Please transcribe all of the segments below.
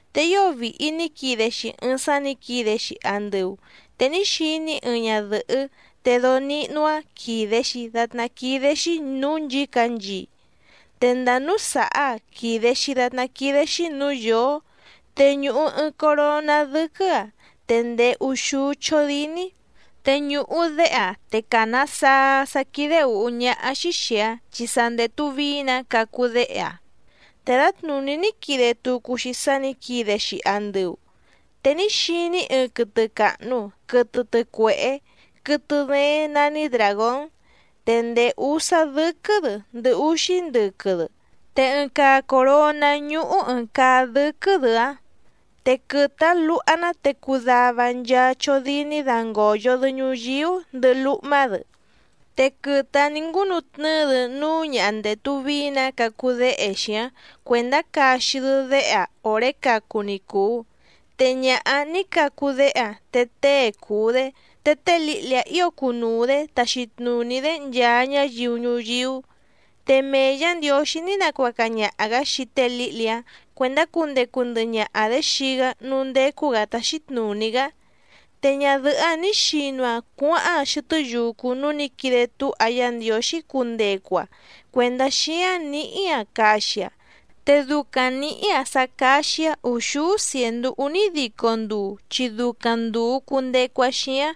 Te ío vìhi ní quide‑xi ɨɨⁿ sá nǐ quide‑xi andɨu, te ní xiní‑í ɨɨⁿ ñadɨ̀hɨ́ te dóó níhnú‑áⁿ quìde‑xi datná quídé‑xí nǔú nchǐcanchii, te ndàa núú sàhá‑aⁿ quìde‑xi datná quídé‑xí nǔú yǒó, te ñùhu ɨɨⁿ coroná dɨ́quɨ́‑aⁿ te ndèé úxúú chódíní. Te ñùhu déhe‑aⁿ te càna saa‑aⁿ sá quídé ǔhú ñáhá‑xí xìi‑aⁿ chi sa ndètu vií‑nǎ cacu déhe‑aⁿ. Te dǎtnùní ní quide tucu‑xi sá nǐ quide‑xi andɨu, te ní xiní‑í ɨɨⁿ quɨtɨ càhnu quɨtɨ tɨcuehé, quɨtɨ dééⁿ nání dràgón, te ndèé úsá dɨ́quɨ́‑dɨ ndɨhɨ úxí ndɨquɨ‑dɨ, te ɨɨⁿ caa coròná ñúhú ɨ̀ɨⁿ caa dɨ́quɨ́‑dɨ‑áⁿ. Te quɨtɨ‑áⁿ luha‑ná te cuu dava nchaa chódíní dángòyo‑dɨ ñuyíú ndɨhɨ lúhmá‑dɨ, te quɨtɨ‑áⁿ nì ngúnu tnɨ́ɨ‑dɨ núú ñaha ndètu vií‑nǎ cacu déhe‑xi‑áⁿ cuèndá caxi‑dɨ déhe‑aⁿ òré cacu ni cùu. Te ñaha‑áⁿ nǐ cacu déhe‑aⁿ te tée cùu‑dé, te té lǐhli‑áⁿ ǐo cunuu‑dě taxi tnùní‑dé nchaa ñáyiu ñuyíú, te mee Yǎ Ndiǒxí ní nacuaca ñaha‑gǎ xii té lǐhli‑áⁿ cuèndá cundecu ndɨhɨ ñaha‑dě xii‑gá núú ndécú‑gǎ táxí tnùní‑gá. Te ñadɨ̀hɨ́‑áⁿ nǐ xinu‑aⁿ cuáháⁿ‑aⁿ xɨtɨ́ yucu núú nǐ quide túha Yá Ndiǒxí cundecu‑aⁿ cuèndá xíáⁿ nǐhí‑aⁿ caxi‑aⁿ, te ducaⁿ nǐhí‑aⁿ sá cáxí‑áⁿ ùxúú cièndú únídico nduu chi ducaⁿ ndùu cundecu‑aⁿ xíáⁿ.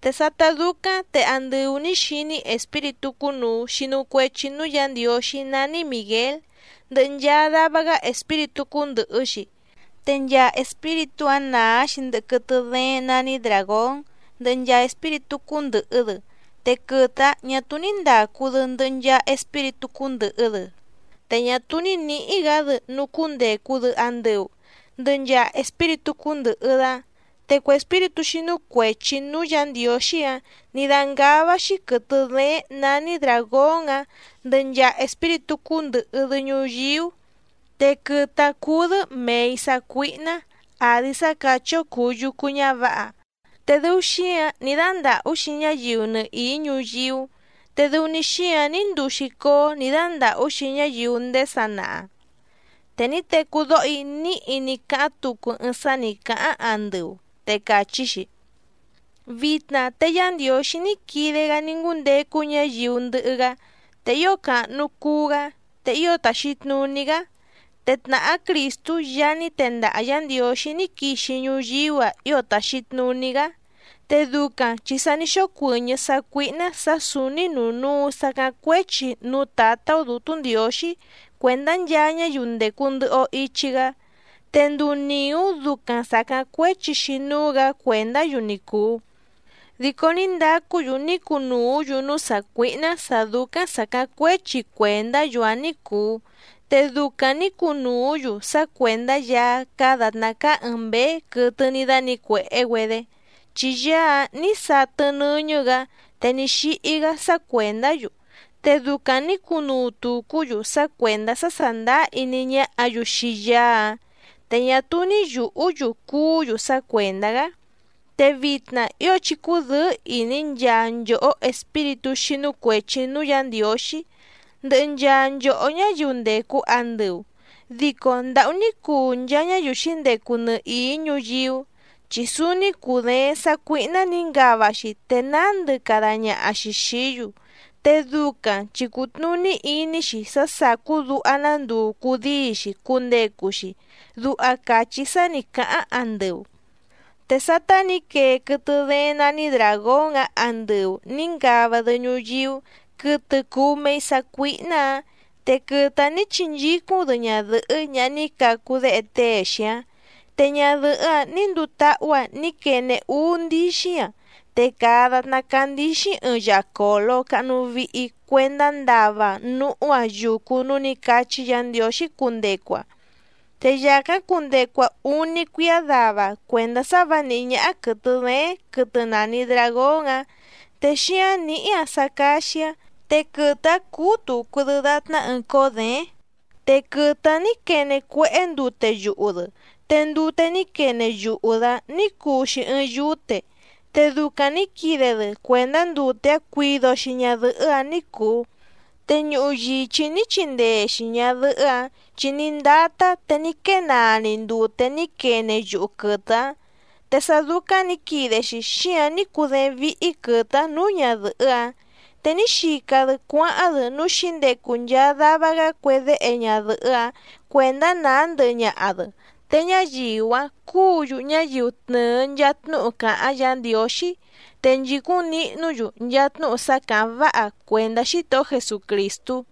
Te sátá dúcáⁿ te andɨu nǐ xiní‑í espíritú cúnùu xinu cuechi núú Yǎ Ndiǒxí nání Mìguél, ndɨhɨ nchaa dava‑gá espíritú cúndɨ̀hɨ‑xi, te nchaa espíritú‑áⁿ nàá‑xi ndɨhɨ quɨtɨ dééⁿ nání dràgón ndɨhɨ nchaa espíritú cúndɨ̀hɨ‑dɨ. Te quɨtɨ‑áⁿ ñà túú ní ndàcu‑dɨ ndɨhɨ nchaa espíritú cúndɨ̀hɨ‑dɨ, te ñá túú ní nǐhí‑gǎ‑dɨ núú cúndècu‑dɨ andɨu ndɨhɨ nchaa espíritú cúndɨ̀hɨ‑dɨ‑áⁿ. Te cue espíritú xínú cuèchi núú Yǎ Ndiǒxí‑áⁿ nǐ dángává‑xí quɨ̀tɨ dééⁿ nání dràgón‑áⁿ ndɨhɨ nchaa espíritú cúndɨ̀hɨ‑dɨ ñuyíú, te quɨtɨ‑áⁿ cúú‑dɨ́ mèi sácuíhná àdi sá càchí‑ó cùu yucu ñávǎha, te dɨu xíǎⁿ ní dándàhú‑xi ñáyiu nɨhìí ñuyíú, te dɨu‑ni xíǎⁿ ní nduu‑xi cóó nǐ dándàhú‑xi ñáyiu ndéé sanaha. Te ní tecú dóho‑í níhi ní cáháⁿ tucu ɨɨⁿ sá nǐ cáháⁿ andɨu, te càchí‑xi: —Vitna te Yá Ndiǒxí ní quide‑gá ní ngúndecu ñáyiu ndɨhɨ‑gá, te ío càhnu cuu‑gá, te ío tàxi tnuní‑gá, te tnàhá Crìstú Yaá ní tendaha Yǎ Ndiǒxí ní quixi ñuyíú‑a ío tàxi tnuní‑gá, te ducaⁿ chi sa ní xócuɨ̀ñɨ́ sácuíhná sǎ sǔúní nùnúu sacáⁿ cuéchi núú Tǎtá‑ó Dǔtú Ndiǒxí cuèndá nchaa ñáyiu ndècu ndɨhɨ‑o ichi‑gá, te nduu nìú ducaⁿ sàcáⁿ cuéchi‑xi núú‑gǎ cuèndá‑yu ni cùu. Dico ní ndacú‑yu ní cunùú‑yu núú sàcuíhná sǎ dúcáⁿ sàcáⁿ cuéchi cuèndá‑yu‑áⁿ ní cùu, te ducaⁿ nǐ cunùú‑yu sá cuèndá Yaá cáá dàtná cáá ɨ̀ɨⁿ mbéé quɨtɨ ní dánǐcuèhé‑güedé, chi Yaá‑áⁿ nǐ satɨ nɨ́ñɨ́‑gǎ te ní xíhí‑gá sá cuèndá‑yu, te ducaⁿ nǐ cunuu tùcú‑yu sá cuèndá sá sàndáá iní ñáhǎ‑yu xii Yaá‑áⁿ, te ñá túú ní yùhú‑yu cuú‑yu sá cuèndá‑gá. Te vitna ío chí cúdɨ̌ɨ́ ìní nchaa nchòhó espíritú xínú cuèchi núú Yǎ Ndiǒxí, ndɨhɨ nchaa nchòhó ñáyiu ndècu andɨu, dico ¡ndàhú ní cuu nchaa ñáyiu xǐndecu nɨhìí ñuyíú! Chi súúní cùdééⁿ sàcuíhná nǐ ngava‑xi te nándɨ cada ñaha‑xi xìí‑yu, te ducaⁿ chi cùtnuní iní‑xi sá sàcú duha‑ná nduu cudíi‑xi cundecu‑xi —duha càchí sá nǐ cáháⁿ andɨu. Te sátá nǐ quee quɨtɨ dééⁿ nání dràgón‑áⁿ andɨu nǐ ngava‑dɨ ñuyíú quɨtɨ cùu mei sácuíhná‑ǎⁿ, te quɨtɨ‑áⁿ nǐ chinchícúⁿ‑dɨ ñadɨ̀hɨ́ ñaha ní cacu déhe tée‑xi‑áⁿ. Te ñadɨ̀hɨ́‑áⁿ nǐ nduu táhú‑aⁿ ní quene úú ndíxí‑aⁿ, te càa datná cáá ndǐxíⁿ ɨɨⁿ yacòlo cahnu vihi cuendá ndava‑aⁿ núhú‑aⁿ yucu núú nǐ cachí Yǎ Ndiǒxí cundecu‑aⁿ, te yàcáⁿ cundecu‑aⁿ úní cuíá dava cuèndá sá vǎ nìhí ñáhá quɨ̀tɨ dééⁿ quɨtɨ nàni dragón‑áⁿ te xíáⁿ nǐhí‑aⁿ sá cáxí‑áⁿ, te quɨtɨ‑áⁿ cúú tùcu‑dɨ datná ɨɨⁿ cóó děéⁿ. Te quɨtɨ‑áⁿ nǐ quene cuéhé ndute yuhu‑dɨ, te ndute ní quene yuhu‑dɨ‑áⁿ nǐ cuu‑xi ɨɨⁿ yúte, te ducaⁿ nǐ quide‑dɨ cuèndá ndute‑áⁿ cuido‑xi ñadɨ̀hɨ́‑áⁿ ní cùu. Te ñuhu yìchí ní chindee‑xi ñàdɨhɨ́‑áⁿ, chi ní ndátá te ní quée naa‑ni ndute ní quene yuhu quɨtɨ‑áⁿ. Te sá dúcáⁿ nǐ quide‑xi xíǎⁿ ní cudééⁿ víhí quɨ̀tɨ‑áⁿ nǔú ñadɨ̀hɨ́‑áⁿ, te ní xica‑dɨ cuáháⁿ‑dɨ núú xǐndecu nchaa dava‑gá cue déhe ñadɨ̀hɨ́‑áⁿ cuèndá nàá ndɨhɨ ñaha‑dɨ, te ñáyiu‑áⁿ cúǔ‑yu ñáyiu tnɨ̀ɨ nchaa tnúhu càháⁿ Yǎ Ndiǒxí, te nchìcúⁿ nihnú‑yu nchaa tnúhu sá càháⁿ váha cuèndá Xítohó Jesucrìstú.